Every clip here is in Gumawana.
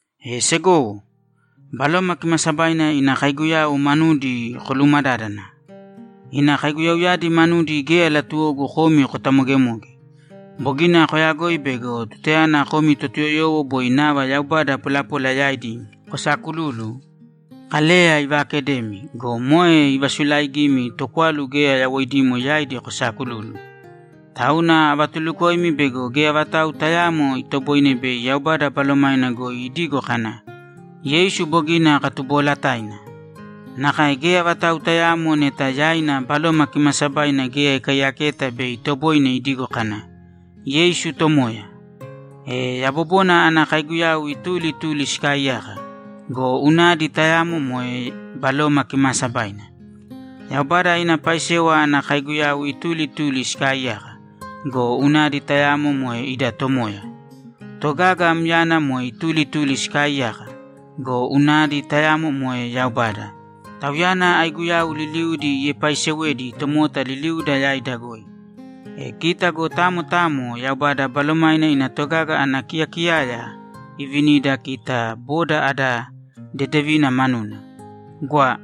E segowo, Baloma Kimaasabaina ina kaiguyau manudi kolumadádana. Ina kaiguyauyadi manudi geya latuwogu komi kotamogemoge. Bogina koyagoi bego tutayana komi Totuyoyowo boi nava yaubada polapola yaidi kosaakululu, Kaleya ivaakedemi go, moe ivasulaigimi tokwalu geya yawoidimo yaidi kosaakululu. Tauna avatulukoimi bego geya vatau tayaamo itoboine bei Yaubada Balomaina goi idigo kana, ‘Yeisu bogina katuboolataina.’ Nakae geya vatau tayaamo neta yaina Baloma Kimaasabaina geya ikaiyaketa bei itoboine idigo kana, ‘Yeisu Tomoya.’ E yabobona ana kaiguyau ituli ituli sikaaiyaka go, unadi tayamo moe Baloma Kimaasabaina. Yaubada ina paisewa ana kaiguyau ituli ituli sikaaiyaka go, unadi tayamo moe ida Tomoya. Togaga myana moe ituli ituli sikaaiyaka go, unadi tayamo moe Yaubada; Tauyana aiguyau liliudi iepaisewedi tomota liliuda yaida goi. E kita go tamo tamo Yaubada Balomaina ina togaga ana kiyakiyaya ivinida kita boda ada dedevina manuna. Gwa.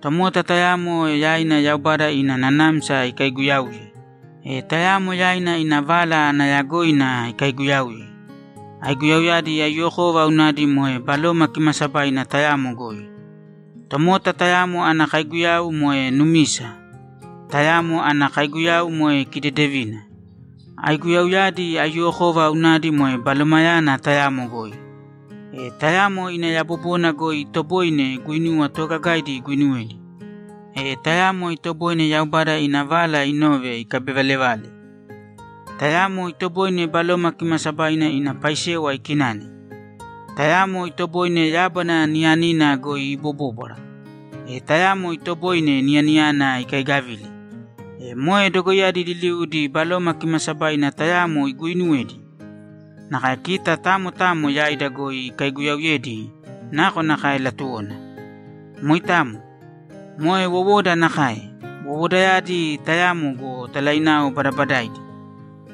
Tomota tayamo yaina Yaubada ina nanamsa ikaiguyauye. E tayamo yaina ina vala ana yagoina ikaiguyauye. Aiguyauyadi aiyuwokova unadi moe Baloma Kimaasabaina tayamo goi. Tomota tayamo ana kaiguyau moe numisa, tayamo ana kaiguyau moe kidedevina. Aiguyauyadi aiyuwokova unadi moe Balomayana tayamo goi. E tayamo ina yabobona goi itoboine guinuwa toogagaidi iguinuwedi. E tayamo itoboine Yaubada ina vala inove ikabivalevale. Tayamo itoboine Baloma Kimaasabaina ina paisewa ikinane. Tayamo itoboine yábana niyanina goi ibobóbwara. E tayamo itoboine niyaniyana ikaigavile. E moe dogoiyadi liliudi Baloma Kimaasabaina tayamo iguuinuwedi. Nakae kita tamo tamo yaida goi ikaiguyaauyedi nakonakae latuwona. Moitamo. Moe wowoda nakae. Wowodayadi tayamo go, talainao badabadaidi.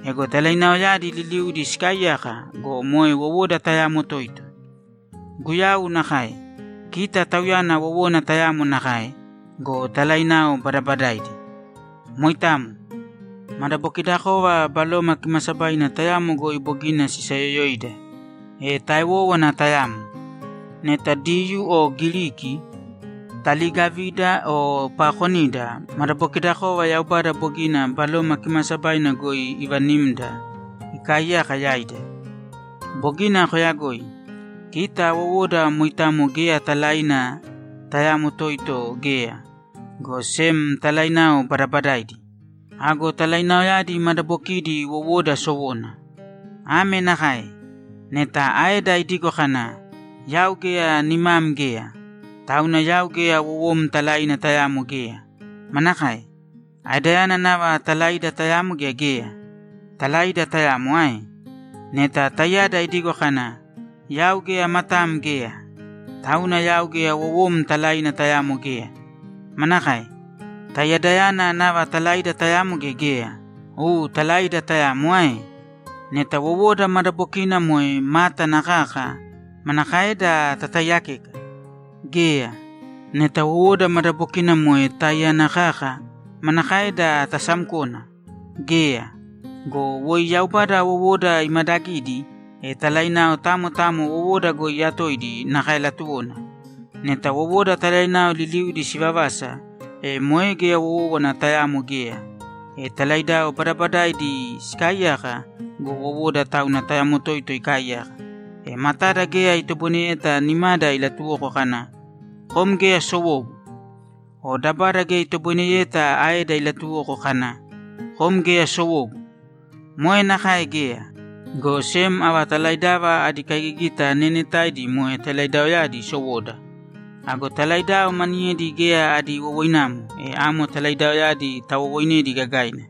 Ego talainaoyadi liliudi sikaaiyaka go, moe wowoda tayamo toito. Guyau nakae. Kita Tauyana wowona tayamo nakae go, talainao badabadaidi. Moitamo. Madabokidakova Baloma Kimaasabaina tayamo goi bogina sisayoyoida, e taewówana tayamo. Neta Diyuu o Giriki, taliigavida o paakonida, madabokidakova Yaubada bogina Baloma Kimaasabaina goi ivanimda ikaaiyaka yaida. Bogina koyagoi. Kita wowoda moitamo geya talaina tayamo toito geya, go sem talainao badabadaidi. Ago talainaoyadi madabokidi wowoda sowona. Ame nakae: Neta aeda idigo kana, ‘Yau geya nimam geya, tauna yau geya wowom talaina tayamo geya’, manakae? Aedayana nava talaida tayamo gea geya? Talaida tayamo ae? Neta taiyada idigo kana, ‘Yau geya matam geya, tauna yau geya wowom talaina tayamo geya’, manakae? Taiyadayana nava talaida tayamo gea geya? U talaida tayamo ae? Neta wowoda madabokina moe mátana kaka, manakaeda tataiyakeka? Geya. Neta wowoda madabokina moe táiyana kaka, manakaeda tasamkona? Geya. Go woi Yaubada wowoda imadagidi, e talainao tamo tamo wowoda goi iyatoidi nakae latuwona. Neta wowoda talainao liliudi sivavasa, e moe geya wówana tayamo geya. E talaidao badabadaidi sikaaiyaka go, wowoda tauna tayamo toito ikaaiyaka. E matada geya itoboineyeta nimada ilatuwoko kana, ‘Kom geya sowogu.’ O dabada geya itoboineyeta aeda ilatuwoko kana, ‘Kom geya sowogu.’ Moe nakae geya, go sem ava talaidava adi kaigigita neenetaidi moe talaidaoyadi sowoda. Ago talaidao maniyedi geya adi wowoinamo, e amo talaidaoyadi tawowoinedi gagaina.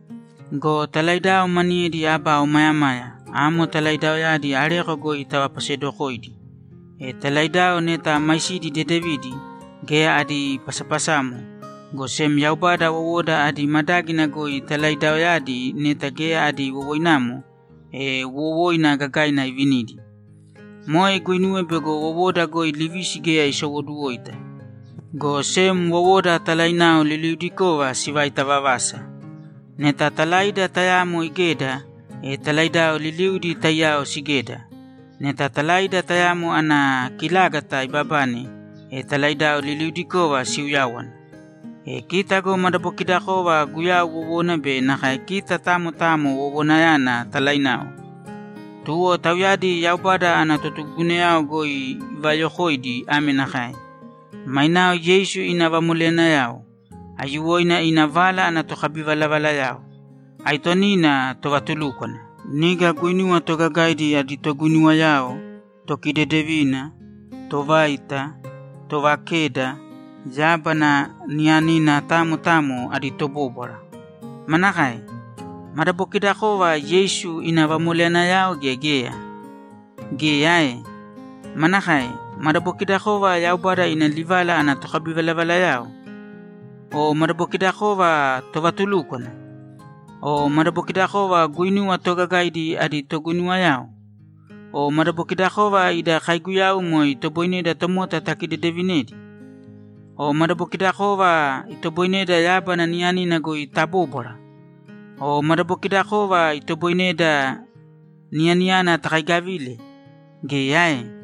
Go talaidao maniyedi aba omayamaya, amo talaidaoyadi areko goi tavapasedokoidi. E talaidao neta maisidi dedevidi, geya adi pasapasamo, go sem Yaubada wowoda adi madágina goi talaidaoyadi neta geya adi wowoinamo, e wowoina gagaina ivinidi. Moe iguinuwe bego wowoda goi livisi geya isowoduwoita, go sem wowoda talainao liliudikova sivaita vavasa. Neta talaida tayamo igeda, e talaidao liliudi taiyao sigeda. Neta talaida tayamo ana kilágata ibabane, e talaidao liliudikova siuyáwana. E kita go madabokidakova Guyau wowona be nakae kita tamo tamo wowonayana talainao. Tuwo tauyadi Yaubada ana totugugunayao goi ivayokoidi ame nakae: Mainao Yeisu ina vamoleyanayao. Aiyuwoina ina vala ana tokabivalavalayao. Aitonina tovatulúkwana. Niga guinuwa toogagaidi adi toguinuwayao, tokidedevina, tovaita, tovakeda, yábana niyanina tamo tamo adi tobóbwara. Manakae? Madabokidakova Yeisu ina vamoleyanayao gea geya? Geya ae? Manakae? Madabokidakova Yaubada ina livala ana tokabivalavalayao? O madabokidakova tovatulúkwana? O madabokidakova guinuwa toogagaidi adi toguinuwayao? O madabokidakova ida kaiguyau moe itoboineda tomota takidedevinedi? O madabokidakova itoboineda yábana niyanina goi tabóbwara? O madabokidakova itoboineda niyaniyana takaigavile? Geya ae?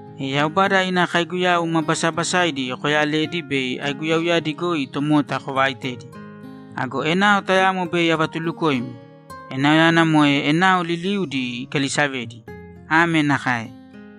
E Yaubada ina kaiguyau ma basabasaidi koyalēdi bei aiguyauyadi goi tomota kovaaitedi. Ago enao tayamo bei avatulukoimi; enaoyana moe enao liliuudi ikalisavedi. Ame nakae: